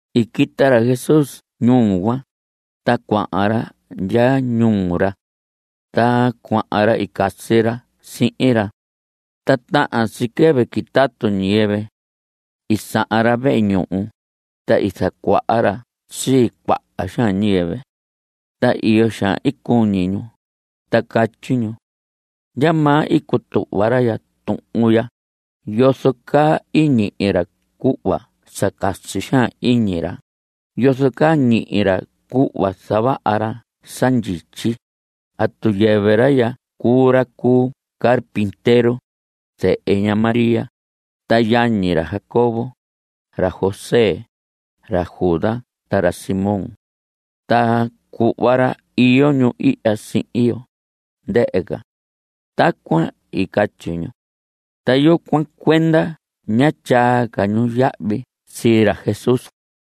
I quita ra Jesús ñuu cuan, ta cuahan ra ndya ñuu ra. Ta cuahan ra i casi ra sihin ra. Ta tahan si quɨvɨ quitatu ñiyɨvɨ. I sahan ra vehe ñuhu, ta i zacuaha ra sii cuaha xaan ñiyɨvɨ. Ta iyo xaan i cuñi ñu, ta catyi ñu: ¿Ndyamaa i cutuhva ra ya tuhun ya? ¿Yozo caa i ñihi ra cuhva sa casi xaan iñi ra? ¿Yozo caa ñihi ra cuhva zavaha ra sa ndyityi? ¿Atu yɨvɨ ra ya cuu ra cu carpintero, zehe ña María, ta yañi ra Jacobo, ra José, ra Judas ta ra Simón? Ta cuhva ra iyo ñu ihya sihin yo, ndɨhɨ ca. Tacuan i catyi ñu. Ta yucuan cuenda ñá tyaa ca ñu yahvi sii ra Jesús.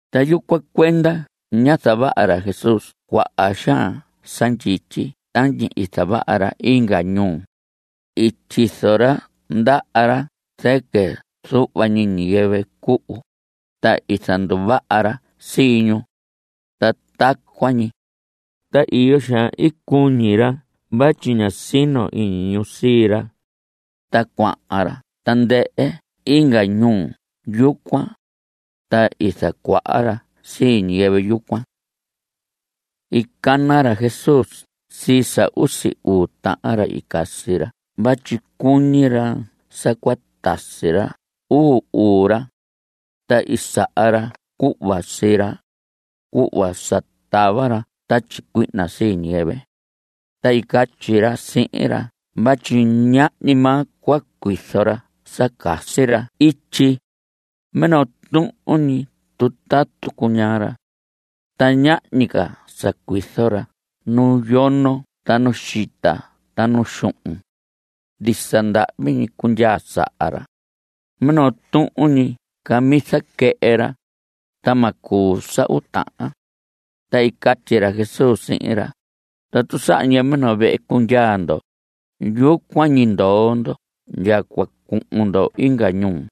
Ta yucuan cuenda ñá zavaha ra Jesús cuaha xaan sa ndyityi tañi i zavaha ra inga ñuu. I tyizo ra ndaha ra zɨquɨ zuhva ñi ñiyɨvɨ cuhu, ta i zanduvaha ra sii ñu. Ta tacuan ñi. Ta iyo xaan i cuñi ra vatyi ñá sino iñi ñu sii ra. Ta cuahan ra tandɨhɨ inga ñuu yucuan. Ta i zacuaha ra sii ñiyɨvɨ yucuan. I cana ra Jesús sii sa usi uu tahan ra i casi ra vatyi cuñi ra sa cua tasi ra uu uu ra. Ta i saha ra cuhva sii ra, cuhva sa tava ra tatyi cuihna sii ñiyɨvɨ. Ta i catyi ra sihin ra vatyi ñahñi maa cua cuizo ra sa casi ra ityi. Minoo tuhun ñi tutatu cuñaa ra. Ta ñahñi ca sa cuizo ra nu yono ta nu xita ta nu xuhun. Ndisa ndahvi ñi cundyaa saha ra. Minoo tuhun ñi camisa quɨhɨ ra, ta ma cuu sa uu tahan. Ta i catyi ra Jesús sihin ra: Tatu saha ñiyɨvɨ minoo vehe cundyaa ndo, yucuan ñi ndoo ndo ndya cua cuhun ndo inga ñuu.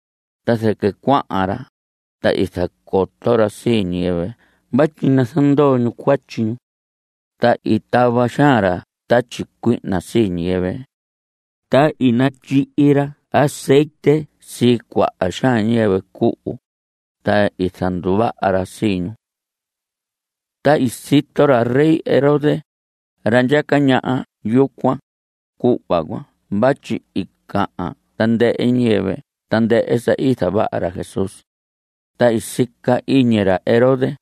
Ta zɨquɨ cuahan ra, ta i zacoto ra sii ñiyɨvɨ vatyi nazandoo ñu cuatyi ñu. Ta i tava xaan ra tatyi cuihna sii ñiyɨvɨ. Ta i natyihi ra azetye sii cuaha xaan ñiyɨvɨ cuhu, ta i zanduvaha ra sii ñu. Ta i sito ra rey Herodes, ra ndyaca ñaha yucuan, cuhva cuan vatyi i cahan tandɨhɨ ñiyɨvɨ tandɨhɨ sa i zavaha ra Jesús. Ta i sica iñi ra Herodes: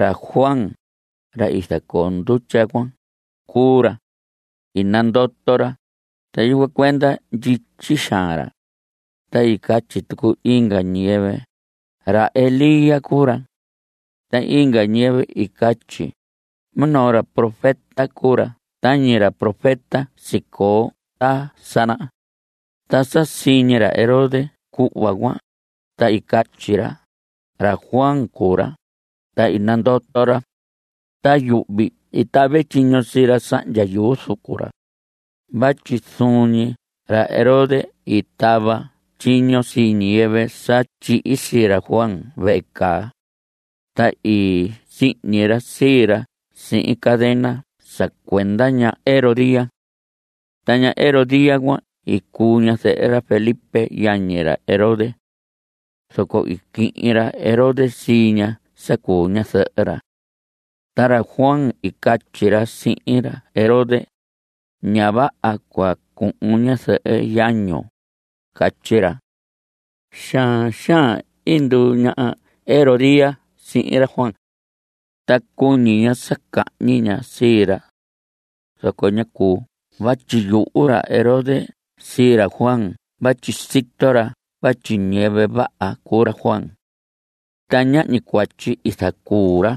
Ra Juan, ra i zacoo ndutya cuan, cuu ra. I nandoto ra, ta yucuan cuenda ndyityi xaan ra. Ta i catyi tucu inga ñiyɨvɨ: Ra Elías cuu ra. Ta inga ñiyɨvɨ i catyi: Minoo ra profeta cuu ra tañi ra profeta sicoo ta sa naha. Ta sa siñi ra Herodes cuhva cuan, ta i catyi ra: Ra Juan cuu ra, ta i nandoto ra. Ta yuhvi i tave tyiño sii ra sahndya yuu zucu ra. Vatyi zuun ñi ra Herodes i tava tyiño sii ñiyɨvɨ sa tyihi sii ra Juan vehe caa. Ta i sihñi ra sii ra sihin cadena sa cuenda ña Herodías. Ta ña Herodías cuan i cuu ñazɨhɨ ra Felipe yañi ra Herodes. Zoco i quihin ra Herodes sii ña sa cuu ñazɨhɨ ra. Ta ra Juan i catyi ra sihin ra Herodes: Ña vaha cua cuhun ñazɨhɨ yañun. Catyi ra. Xaan xaan i nduu ña Herodías sihin ra Juan. Ta cuñi ña sa cahñi ña sii ra. Zoco ñá cuu vatyi yuhu ra Herodes sii ra Juan vatyi sito ra vatyi ñiyɨvɨ vaha cuu ra Juan. Ta ñahñi cuatyi i zacuu ra.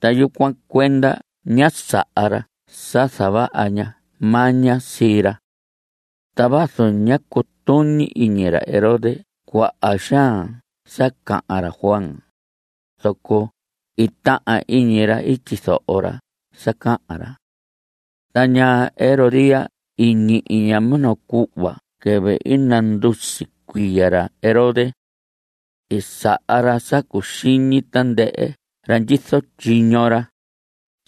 Ta yucuan cuenda ñá saha ra sa zavaha ña maña sii ra. Ta vazu ñá cutuñi iñi ra Herodes cuaha xaan sa cahan ra Juan, zoco i tahan iñi ra tyizoho ra sa cahan ra. Ta ña Herodías i ñihi ña minoo cuhva quɨvɨ i nandusi cuiya ra Herodes. I saha ra sa cuxiñi tandɨhɨ ra ndyizo tyiño ra,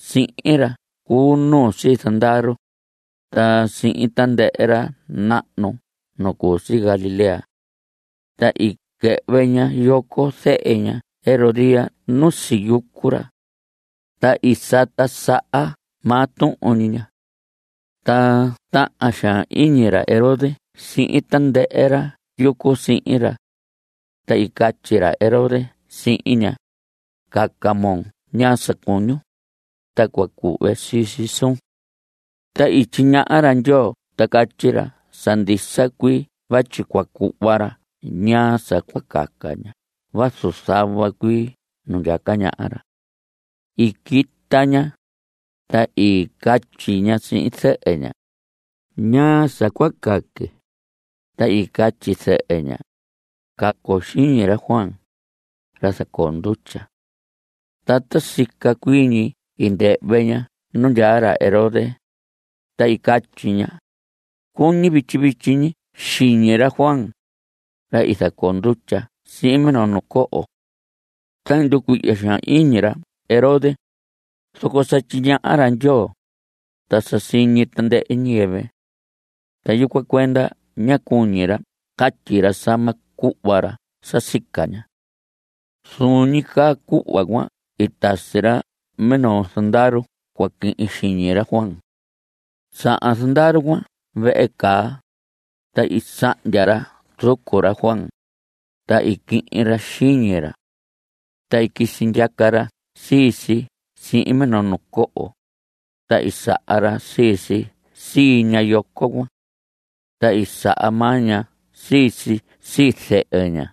sihin ra cu nuu sii zandaru, ta sihin tandɨhɨ ra nahnu nu cu si Galilea. Ta i quɨhvɨ ña yoco zehe ña Herodías nu siyucu ra. Ta i sata saha maa tuhun ñi ña. Ta tahan xaan iñi ra Herodes sihin tandɨhɨ ra yucu sihin ra. Ta i catyi ra Herodes sihin ña: Caca moo ñaa sa cuñun, ta cua cuhve sii si suun. Ta i tyiñaha ra Ndyoo ta catyi ra sa ndisa cuii vatyi cua cuhva ra ñaa sa cua caca ña vazu zava cuii ñuu ndyaca ñaha ra. I quita ña, ta i catyi ña sihin zɨhɨ ña: ¿Ñaa sa cua caque? Ta i catyi zɨhɨ ña: Cacon xiñi ra Juan, ra zacoo ndutya. Ta ta sica cuii ñi i ndɨhvɨ ña nu ndyaa ra Herodes, ta i catyi ña: Cuñi vityi vityi ñi xiñi ra Juan, ra i zacoo ndutya sihin minoo nu coho. Ta i nducuihya xaan iñi ra Herodes, zoco sa tyiñaha ra Ndyoo, ta sa siñi tandɨhɨ ñiyɨvɨ. Ta yucuan cuenda ñá cuñi ra catyi ra sa ma cuhva ra sa sica ña. Zuun ñi caa cuhva cuan i tasi ra minoo zandaru cua quihin xiñi ra Juan. Sahan zandaru cuan vehe caa, ta i sahndya ra zucu ra Juan, ta i quihin ra xiñi ra. Ta i quisi ndyaca ra sii si sihin minoo nu coho, ta i saha ra sii si sii ña yoco cuan. Ta i saha maa ña sii si sii zɨhɨ ña.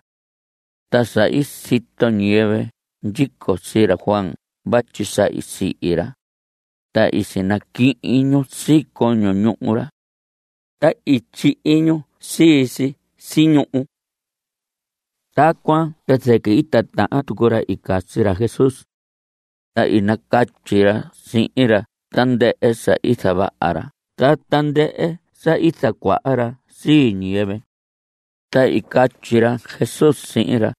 Ta sa i sito ñiyɨvɨ ndyico sii ra Juan vatyi sa i sihi ra, ta i sinaquihin ñu sii coño ñuhu ra. Ta i tyihi ñu sii si si ñuhu. Tacuan ta zɨquɨ i titahan tucu ra i casi ra Jesús. Ta i nacatyi ra sihin ra tandɨhɨ sa i zavaha ra ta tandɨhɨ sa i zacuaha ra sii ñiyɨvɨ. Ta i catyi ra Jesús sihin ra: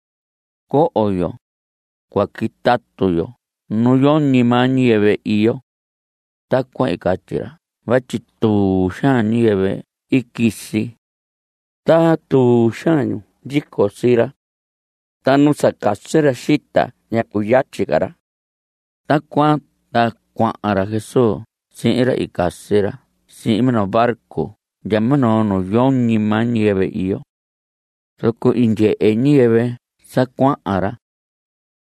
Coho yo; cua quitatu yo nu yoñi maa ñiyɨvɨ iyo. Tacuan i catyi ra vatyi tuu xaan ñiyɨvɨ i quisi. Ta tuu xaan ñu ndyico sii ra. Ta nu sa casi ra xita ta ñá cuyatyi ca ra. Tacuan ta cuahan ra Jesús sihin ra i casi ra sihin minoo barco ndya minoo nu yoñi maa ñiyɨvɨ iyo. Zoco i ndyehe ñiyɨvɨ sa cuahan ra.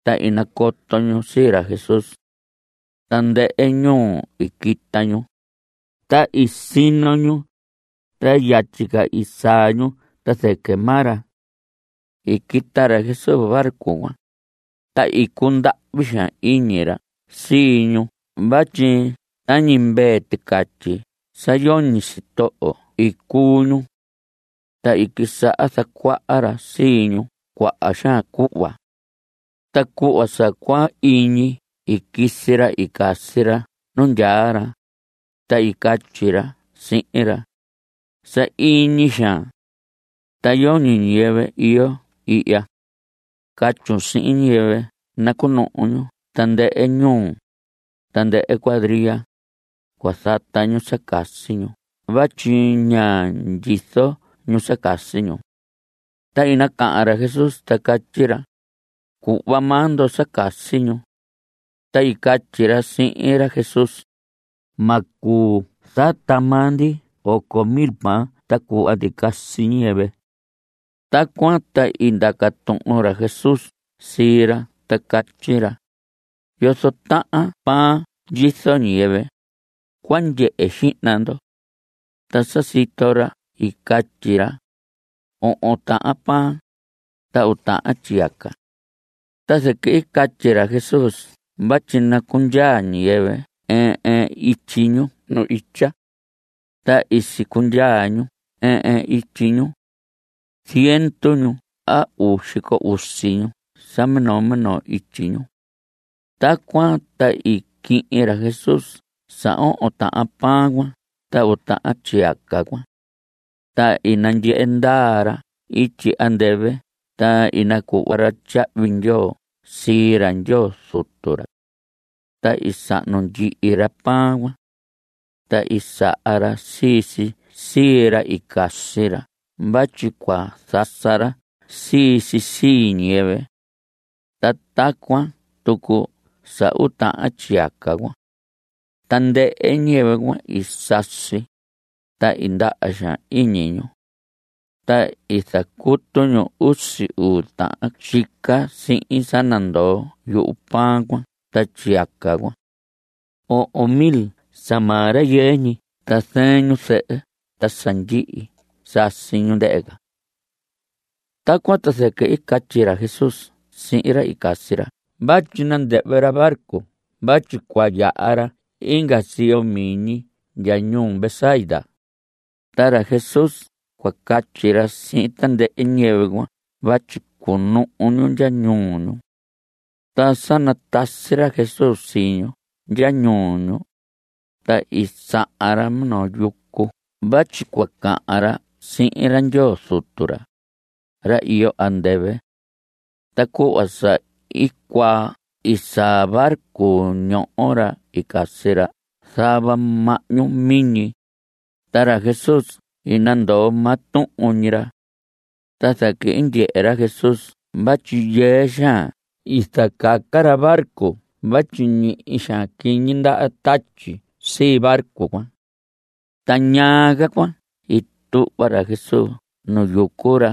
Ta i nacoto ñu sii ra Jesús. Tandɨhɨ ñuu i quita ñu. Ta i sino ñu. Ta yatyi ca i saa ñu ta zɨquɨ maa ra. I quita ra Jesús barco cuan, ta i cundahvi xaan iñi ra sii ñu vatyi tañi mvee ticatyi sa yoñi sitoho i cuu ñu. Ta i quisaha zacuaha ra sii ñu cuaha xaan cuhva. Ta cuhva sa cua iñi i quisi ra i casi ra nu ndyaa ra, ta i catyi ra sihin ra: Sahiñi xaan. Ta yoñi ñiyɨvɨ iyo ihya. Catyun sihin ñiyɨvɨ nacuhun ñu tandɨhɨ ñuu, tandɨhɨ cuadria, cua zata ñu sa casi ñu vatyi ña ndyizo ñu sa casi ñu. Ta i nacahan ra Jesús, ta catyi ra: Cuhva maa ndo sa casi ñu. Ta i catyi ra sihin ra Jesús: Ma cuu zata maa ndi oco mil pan ta cuhva ndi casi ñiyɨvɨ. Tacuan ta i ndaca tuhun ra Jesús sii ra ta catyi ra: ¿Yozo tahan pan ndyizo ñiyɨvɨ? Cua ndyehe xihna ndo. Ta sa sito ra i catyi ra: Ohon tahan pan, ta uu tahan tyiyaca. Ta zɨquɨ i catyi ra Jesús vatyi nacundyaa ñiyɨvɨ ɨɨn ɨɨn ityi ñu nu itya. Ta i sicundyaa ñu ɨɨn ɨɨn ityi ñu. Ziendu ñu a uu xico usi ñu sa minoo minoo ityi ñu. Tacuan ta i quihin ra Jesús sa ohon tahan pan cuan ta uu tahan tyiyaca cuan. Ta i nandyehe ndaa ra ityi andɨvɨ, ta i nacuhva ra tyahvi ndyoo sii ra Ndyoo Zutu ra. Ta i sahnu ndyihi ra pan cuan. Ta i saha ra sii si sii ra i casi ra vatyi cua zasa ra sii si sii ñiyɨvɨ. Ta tacuan tucu sa uu tahan tyiyaca cuan. Tandɨhɨ ñiyɨvɨ cuan i sasi, ta i ndaha xaan iñi ñu. Ta i zacutu ñu usi uu tahan tyica sihin sa nandoo yuhu pan cuan ta tyiyaca cuan. Ohon mil sa maa rayɨɨ ñi ta zɨɨn ñu zɨhɨ ta sa ndyihi sasi ñu, ndɨhɨ ca. Tacuan ta zɨquɨ i catyi ra Jesús sihin ra i casi ra vatyi nandɨhvɨ ra barco vatyi cua yaha ra inga siyo miñi ndya ñuu Betsaida. Ta ra Jesús cua catyi ra sihin tandɨhɨ ñiyɨvɨ cuan vatyi cunuhu ñu ndya ñuu ñu. Ta sa natasi ra Jesús sii ñu ndya ñuu ñu, ta i sahan ra minoo yucu vatyi cua cahan ra sihin ra Ndyoo Zutu ra, ra iyo andɨvɨ. Ta cuhva sa i cuaa i saa barco ñoho ra i casi ra zava mahñu miñi, ta ra Jesús i nandoo maa tuhun ñi ra. Ta zɨquɨ i ndyehe ra Jesús vatyi yɨɨ xaan i zacaca ra barco vatyi ñihi xaan quiñi ndaha tatyi sii barco cuan. Ta ñaa ca cuan i tuhva ra Jesús nu yucu ra.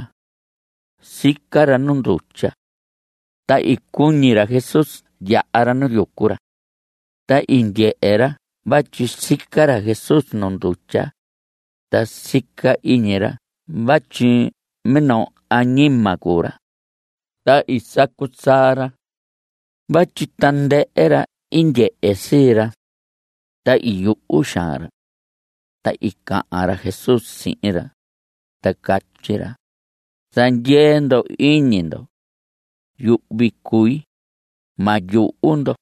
Sica ra nu ndutya. Ta i cuñi ra Jesús yaha ra nu yucu ra. Ta i ndyehe ra vatyi sica ra Jesús nu ndutya, ta sica iñi ra vatyi minoo añima cuu ra. Ta i sacu saa ra vatyi tandɨhɨ ra i ndyehe sii ra. Ta i yuhu xaan ra. Ta i cahan ra Jesús sihin ra, ta catyi ra: Zandyee ndo iñi ndo. Yuhvi cui. Ma yuhu ndo.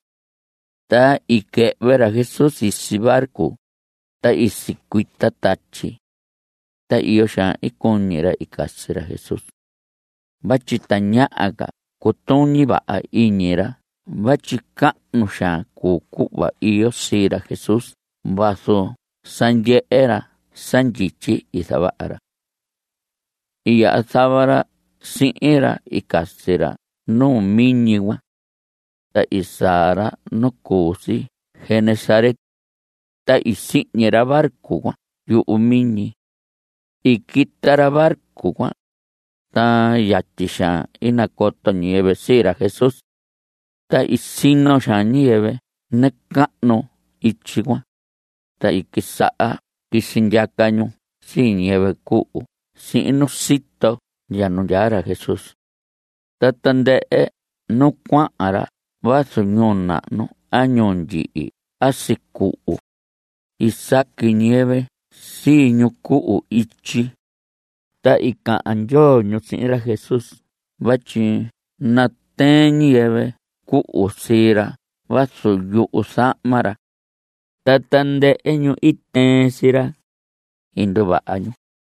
Ta i quɨhvɨ ra Jesús sisi barco, ta i sicuita tatyi. Ta iyo xaan i cuñi ra i casi ra Jesús vatyi tañaha ca cutuñi vaha iñi ra vatyi cahnu xaan cuu cuhva iyo sii ra Jesús vazu sa ndyehe ra sa ndyityi i zavaha ra. I yaha zava ra sihin ra i casi ra nu miñi cuan. Ta i saa ra nu cu si Genesaret. Ta i sihñi ra barco cuan yuhu miñi. I quita ra barco cuan, ta yatyi xaan i nacoto ñiyɨvɨ sii ra Jesús. Ta i sino xaan ñiyɨvɨ nacahnu ityi cuan, ta i quisaha quisi ndyaca ñu sii ñiyɨvɨ cuhu sihin nu sito ndya nu ndyaa ra Jesús. Ta tandɨhɨ nu cuahan ra vazu ñuu nahnu a ñuu ndyihi a sicuhu, i saqui ñiyɨvɨ sii ñu cuhu ityi. Ta i cahan ndyoo ñu sihin ra Jesús vatyi natɨɨn ñiyɨvɨ cuhu sii ra vazu yuzahma ra. Ta tandɨhɨ ñu i tɨɨn sii ra, i nduvaha ñu.